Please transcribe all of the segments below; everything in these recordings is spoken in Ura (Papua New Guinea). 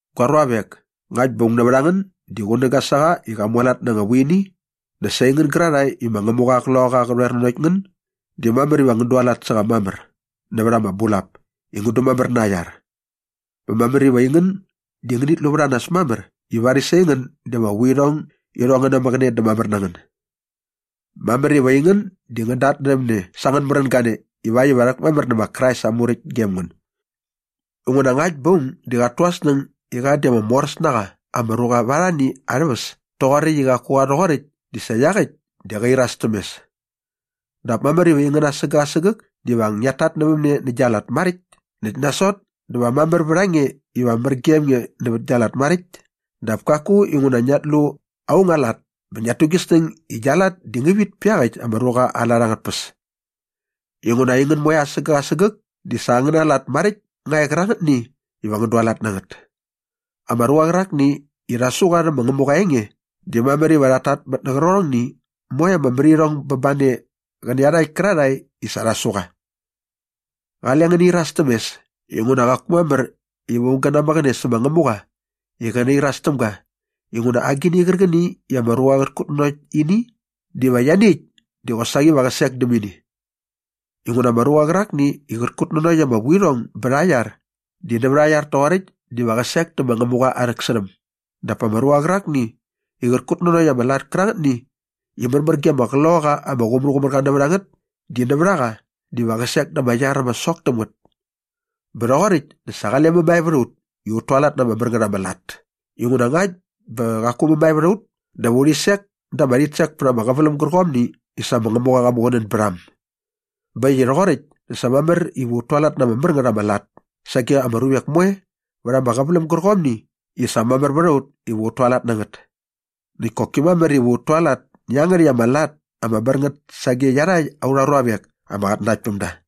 Gua ruavek, ngakt bä aung nävät a ngän di qunäga sä qa i qa mualat na anga vuini dä sa aingän gärarhae i ma Ngämuqa aa Qloqaqa di qä rhoer nanokt ngän di mamär iva ngän dualat sä qa mamär nävät ama bulap i ngän dumamär na aa iar. Bä mamär iva aingän di ngänit lu vät a nas mamär i varis aingän di ama vuirhong irhong ngä namäqäne dä mamär na ngän. Mamär iva aingän di ngän datnärhäm ne sa angän märän gane ivakt iva rhäkmamär nä ma Krais aa muräkt gem ngän. Inguna ngakt bä aung di qat tu aa snäng i qa di ama moräs na qa ama ruqa vät arhani arhä väs toqoräkt i qaku qa rhoqoräkt di sa iaqäkt di qä iras täm mes. Dap mamär iva aingän asägäk asägäk di va ngiat tatnävämne nä gia lat maräkt näkt nasot dä va mamär vät a nge iva mär gem nge nävät gia lat maräkt dap kaku inguna ngiat lu aung aa lat bä ngiat tu gi snäng i gia lat di ngä vit pä iaqäkt ama ruqa aa lat angät tpäs. Inguna aingän moe asägäk asägäk di sa angäna lat maräkt nga e qärangätni iva ngän dualat na ngät. Ama ruqa qärakni i rha su qa rhä ma Ngämuqa aa enge di mamär iva qat tatmät nä qärqärhongni moe ama märirhong bä ba ne qä nä iarhakt kärarhae i sa rhi su qa. Qale ngäni iras täm mes inguna qaku mamär iva aung gä namäqäne sä ma Ngämuqa i qä nairas täm ga inguna agini qärqäni i ama ruqa qät kutnanokt ini diva ianiäkt di qosaqi va qä sek däm ini. Inguna ama ruqa qärakni i qät kutnanokt ama vuirhong bät aa iar di nävät aa iar toqoräkt diva qä sek dä ma Ngämuqa aa rhäksärhäm dap pa ama ruqa qärakni i qät kutnanokt ama lat kärangätni i märmär ge ama Qloqaqa ama Qumärqumärqa nävät a ngät di nävät a qa diva qä sek da ama iar ama sok täm ngät. Bä rhoqoräkt dä sa qale mämae vät a ut i ut tualat na ama mär ngät ama lat inguna ngakt bä qaku mämae vät a ut dä va urhi sek da ama rhitsek pät ama qäväläm gärqomni i sa ma Ngämuqa qa muqunän bät a äm. Bä äkt i rhoqoräkt dä sa mamär iva ut tualat na ama mär ngät ama lat sage ama ruvek moe vät ama qäväläm gärqomni i sa mamär vät a ut iva ut tualat na ngät. Näkt koki mamär iva ut tualat nä iangärhäkt ama lat ama mär ngät sage iarhakt aurha ruavek ama qatnanaktpämda.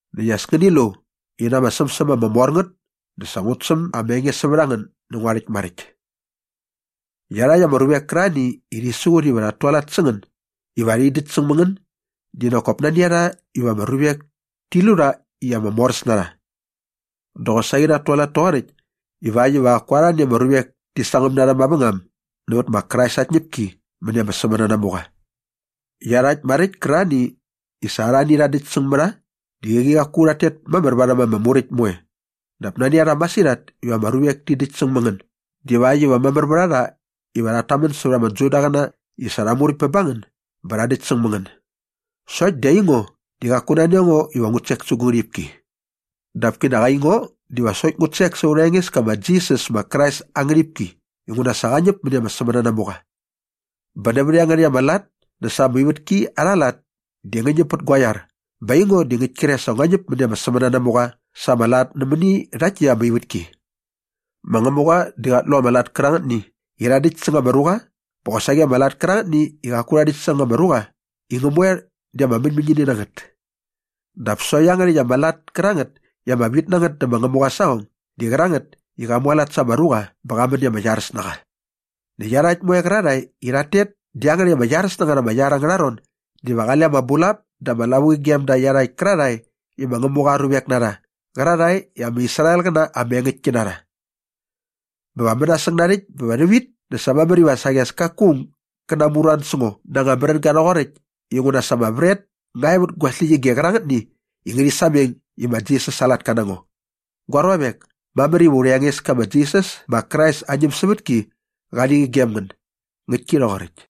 Näkt as ngäni lu i na ama sämsäm ama mor ngät dä sa ngut säm ama enge sävät a ngän nä ngua rhäkt maräkt. Iarhakt ama ruvek kärarhani i rhi siqut iva rhat tualat sä ngän iva rhi däkt säng mä ngän di nak kop nani a rha iva ama ruvek ti lu rha i ama moräs na rha. Dä qosaqi rhat tualat toqoräkt ivakt iva qaku arhani ama ruvek ti sangäm na rha mavängam nävät ma Krais aa tñäpki mäni ama sämänanamuqa. Iarhakt maräkt kärarhani i sa arhani rha däkt säng mä rha di qäqi qaku rhat tet mamär varhäm ama Muräkt moe dap nani a rha masirhat iva ama ruvek ti däkt säng mä ngän divakt iva mamär vät a rha iva rhat tamän sävät ama Judaqäna i sa rha muräkt bä ba ngän bä rha däkt säng mä ngän. Sokt di aingo di qaku nani a ngo iva ngut sek sä gu ngärhipki. Dap kinak aingo diva sokt ngut sek sa aurha Engeska ma Jisas ma Krais aa ngärhipki inguna sa qa ñäp mäni ama sämänanamuqa. Bä nävät iangärhäkt ama lat dä sa ama ivätki arha lat di ngä ñäp pät gua iar bä aingo di ngäkt kre sa ngua ñäp mäni ama sämänanamuqa sa ama lat nämäni rhakt täkt ama ivätki. Ma Ngämuqa di qat lu ama lat kärangätni i rha däkt säng ama ruqa bä qosaqi ama lat kärangätni i qaku rha däkt säng ama ruqa i ngä moe di ama mäñmäñini na ngät. Dap sokt iangärhäkt ama lat kärangät i ama vit na ngät dä ma Ngämuqa aa saqong di qärangät i qa mualat sa ama ruqa bä qa män i ama iaräs na qa. Näkt iarhakt moe qärarhae i rhat tet dä iangärhäkt ama iaräs na ngät ama iar angärha ron diva qale ama bulap dä ama lavuqi gem da iarhakt kärarhae i ma Ngämuqa aa ruvek na rha qärarhae i ama Israelqäna ama engäktki na rha. Bä va mänasäng narhäkt bä va rhävit dä sa mamär iva saqi as kaku aung gä namuran sä ngo na anga märänga rhoqoräkt inguna sa ama vret nga e vät gu släqyige qärangätni i ngärhi sameng i ma Jisas aa latka na ngo. Gua ruavek, mamär iva aurha Engeska ma Jisas ma Krais aa ñämsävätki qali qi gem ngän. Ngäktki rhoqoräkt.